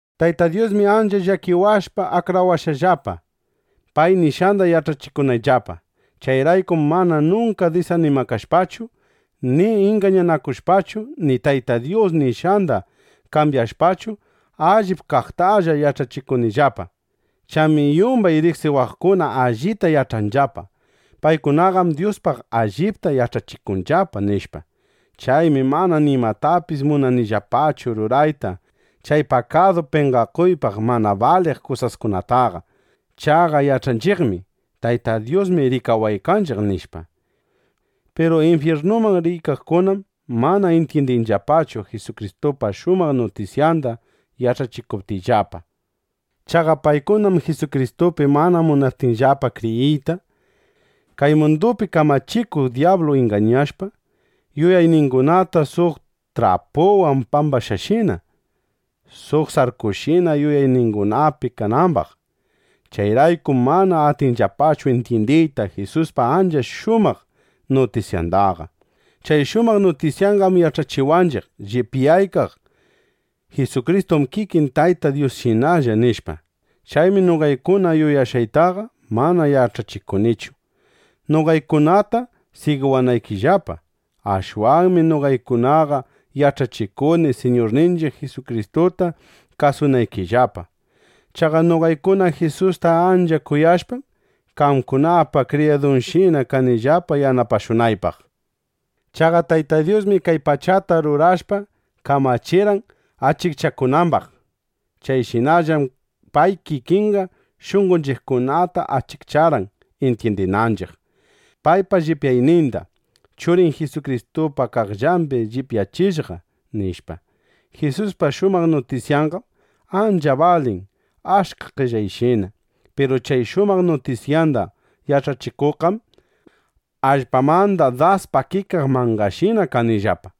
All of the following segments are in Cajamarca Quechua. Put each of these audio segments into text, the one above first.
Tayta Dyusmi ancha llakipawashpa, akrawashqallapa, pay nishqanda yach'achikunayllapa. Chayraykum mana nunka disanimakashpachu ni ingañakushpachu ni Tayta Dyus nishqanda kambyashpachu, allip kaqtalla yach'achikunillapa. Chaymi yumbay riqsiwaqkunaqa allita yach'anllapa: Paykunaqam Dyuspaq allipta yach'achikunllapa, nishpa. Chaymi mana nimatapis munanillapachu rurayta chay pakadu penqakuypaq mana baliq kusaskunataqa. Chaqa yach'anchiqmi: Tayta Dyusmi rikawaykanchiq, nishpa. Piru infyirnuman riykaqkunam mana intyindinllapachu Jisukristupa shumaq nutisyanda yach'achikuptiyllapa. Chaqa paykunam Jisukristupi mana munaptinllapa kriyiyta, kay mundupi kamachikuq dyablu ingañashpa, yuyayningunata suq trapuwan pambashqashina, suq sarkushina yuyayningunapi kanambaq. Chayraykum mana atinllapachu intyindiyta Jisuspa ancha shumaq nutisyandaqa. Chay shumaq nutisyanqam yach'achiwanchiq: Llipyaykaq Jisukristum kikin Tayta Dyusshinalla, nishpa. Chaymi noqaykuna yuyashqaytaqa mana yach'achikunichu, (noqaykunata sigiwanaykillapa.) Ashwanmi noqaykunaqa yach'achikuni, Siñurninchiq Jisukristuta kasunaykillapa. Chaqa noqaykuna Jisusta ancha kuyashpam, qamkunapa kriyaduykishina kanillapa yanapashunaypaq. Chaqa Tayta Dyusmi kay pachata rurashpa, kamachirqan achikchakunambaq. Chayshinallam pay kikinqa shunqonchiqkunata achikcharqan intyindinanchiq: Paypa llipyayninda Churin Jisukristupa qaqllambi llipyachishqa, nishpa. Jisuspa shumaq nutisyanqam ancha balin achka qellayshina. Piru chay shumaq nutisyanda yach'achikuqqam allpamanda das pakikaq mangashinalla kanillapa.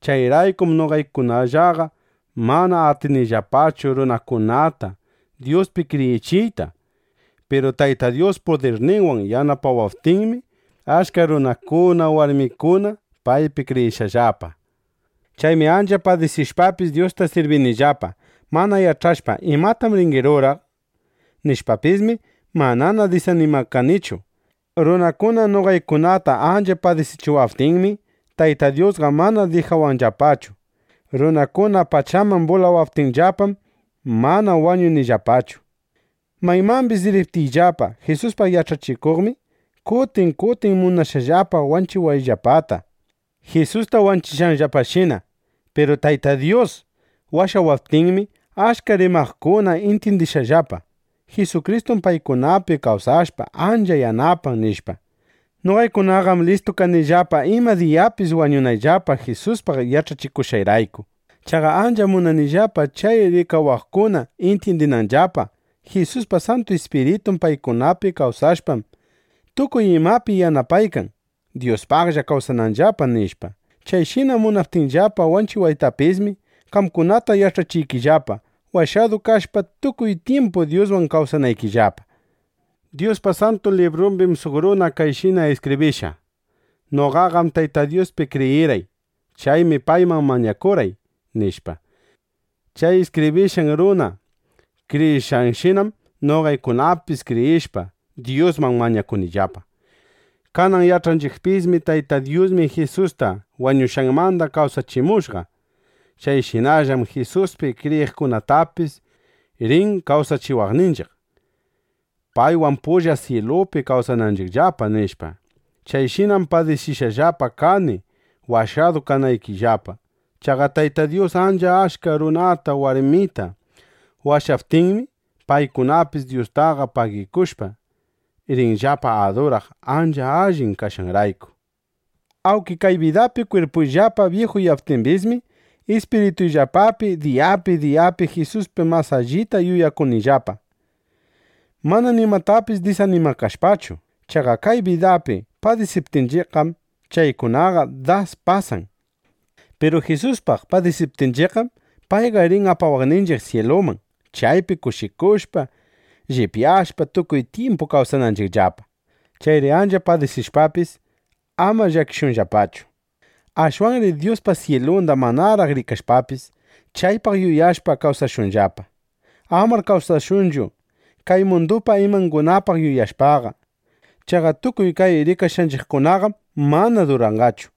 Chayraykum noqaykunallaqa mana atinillapachu runakunata Dyuspi kriyichiyta. Piru Tayta Dyus pudirninwan yanapawaptinmi, achka runakuna, warmikuna paypi kriyishqallapa. Chaymi ancha padisishpapis, Dyusta sirbinillapa. Mana yach'ashpa: ¿Imatam rini ruraq? nishpapismi, mana disanimakanichu. Runakuna noqaykunata ancha padisichiwaptinmi, Tayta Dyusqa mana dijawanllapachu. Runakuna pachaman bulawaptinllapam, mana wañunillapachu. Maymambis riptiyllapa Jisuspaq yach'achikuqmi, kutin kutin munashqallapa wanchiwayllapata, Jisusta wanchishqanllapashina. Piru Tayta Dyus washawaptinmi, achka rikawaqkuna intyindishqallapa: Jisukristum paykunapi kawsashpa, ancha yanapan, nishpa. Noqaykunaqam listu kanillapa ima diyapis wañunayllapa Jisuspaq yach'achikushqayrayku. Chaqa ancham munanillapa chay rikawaqkuna intyindinanllapa: Jisuspa Santu Ispiritun paykunapi kawsashpam, tukuy imapi yanapaykan, Dyuspaqlla kawsananllapa, nishpa. Chayshina munaptinllapa wanchiwaytapismi, qamkunata yach'achiykillapa, washadu kashpa, tukuy tyimpu Dyuswan kawsanaykillapa. Dyuspa Santu Librumbim suq runa kayshina iskibrishqa: “Noqaqam Tayta Dyuspi kriyirqay. Chaymi payman mañakurqay”, nishpa. Chay iskibrishqan runa kriyishqanshinam noqaykunapis kriyishpa, Dyusman mañakunillapa. Kanan yach'anchiqpismi: Tayta Dyusmi Jisusta wañushqanmanda kawsachimushqa. Chayshinallam Jisuspi kriyiqkunatapis rin kawsachiwaqninchiq, paywan pulla syilupi kawsananchiqllapa, nishpa. Chayshinam padisishqallapa kani, washadu kanaykillapa. Chaqa Tayta Dyus ancha achka runata, warmita washaptinmi, paykunapis Dyustaqa pagikushpa, rinllapa aduraq, ancha allin kashqanrayku. Awnki kay bidapi kwirpuyllapa byijuyaptimbismi, ispirituyllapapi diyapi diyapi Jisuspi mas allita yuyakuykanillapa, mana nimatapis disanimakashpachu. Chaqa kay bidapi padisiptinchiqqam, chaykunaqa das pasan. Piru Jisuspaq padisiptinchiqqam, payqa rin apawaqninchiq syiluman, chaypi kushikushpa, llipyashpa, tukuy tyimpu kawsananchiqllapa. (Chayri ancha padisishpapis, ama llakishunllapachu.) Ashwanri Dyuspa syilunda manaraq rikashpapis, chaypaq yuyashpa kawsashunllapa. Amar kawsashunchu kay mundupa imangunapaq yuyashpaqa. Chaqa tukuy kay rikashqanchiqkunaqam mana duranqachu.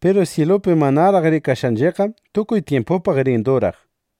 Piru syilupi manaraq rikashqanchiqqam tukuy tyimpupaq rin duraq.